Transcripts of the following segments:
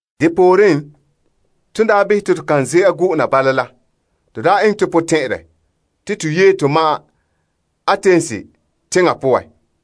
Depooren, ton daa behɛ te to kan ze'a go'ona bala la, to daa eŋɛ to potɛn'ɛrɛ te to yee to ma'an Atens teŋa poan.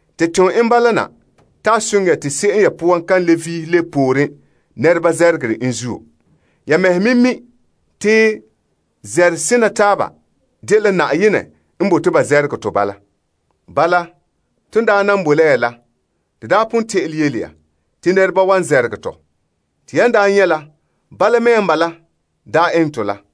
Te ton en bala na te a soŋɛ ya te se'em ya poan kan le vihe lebe pooren namehegɔ la zuo. Ya mɛhe me mi' te namehe kona taaba dela Na'ayenɛ n bote ba namehe tɔ bala. Bala, ton daa nan boe la ya la, to daa pon te'ele yele ya te nɛreba wan namehe tɔ. Te yan daa nyɛ' la, bala mea n bala daa eŋɛ tɔ la.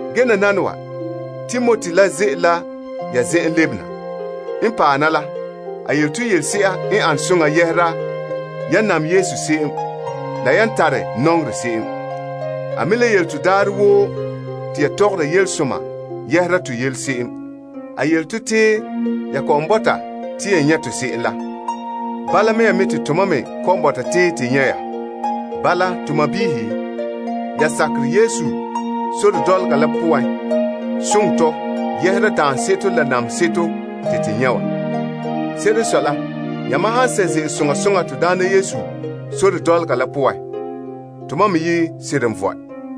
Ge nananawa, Timoti la ze'ele ya zen'en lebena. N paɛ na la, a yele to yelese'a n ane soŋa yɛhera ya nam Yesu se'em la yan tare nɔŋerɛ se'em. A me le yele to te daarɛ woo yan tɔgɔre yelesoma yɛhera to yele se'em. A yele to te ya kɔ'ɔn bɔta te ya nyɛ' tɔ se'em la, bala mea me te tomam me kɔ'ɔn bɔta te nyɛ' ya. Bala, to sɔɔnrɔ, ya sakerɛ Yesu sore dɔlɔga la poan soŋɛ tɔ yɛhera daanseto la namehe seto te to nyɛ' wa. Se'ere n sɔe la, yamam han sɛ' ze'ele soŋa soŋa Na'ayenɛ sore dɔlɔga la poan, tomam me yi' seren vɔe.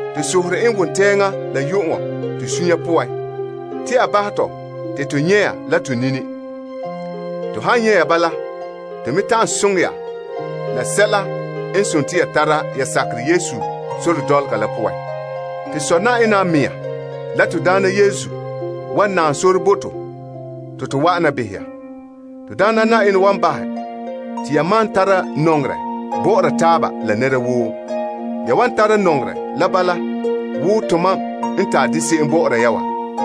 To sohore en wontɛɛŋa la yu'uŋɔ to suunre poan te a bahɛ tɔ te to nyɛ' ya la to nini. To han nyɛ' ya bala, to me ta'an soŋɛ ya la sɛla n dela ya tara ya sakerɛ Yesu sore dɔlɔga la poan. To Sɔ Yenɛ a mɛŋa la to Na'ayenɛ Yesu wan naam sore bo to te to wa'ana behɛ ya. Na'ayenɛ wan bahɛ te ya malom tara nɔŋerɛ bɔ'ɔra taaba la nɛra woo. Ya wan tara nɔŋerɛ la bala wo tomam n tare dɛ se'em bɔ'ɔra ya wa.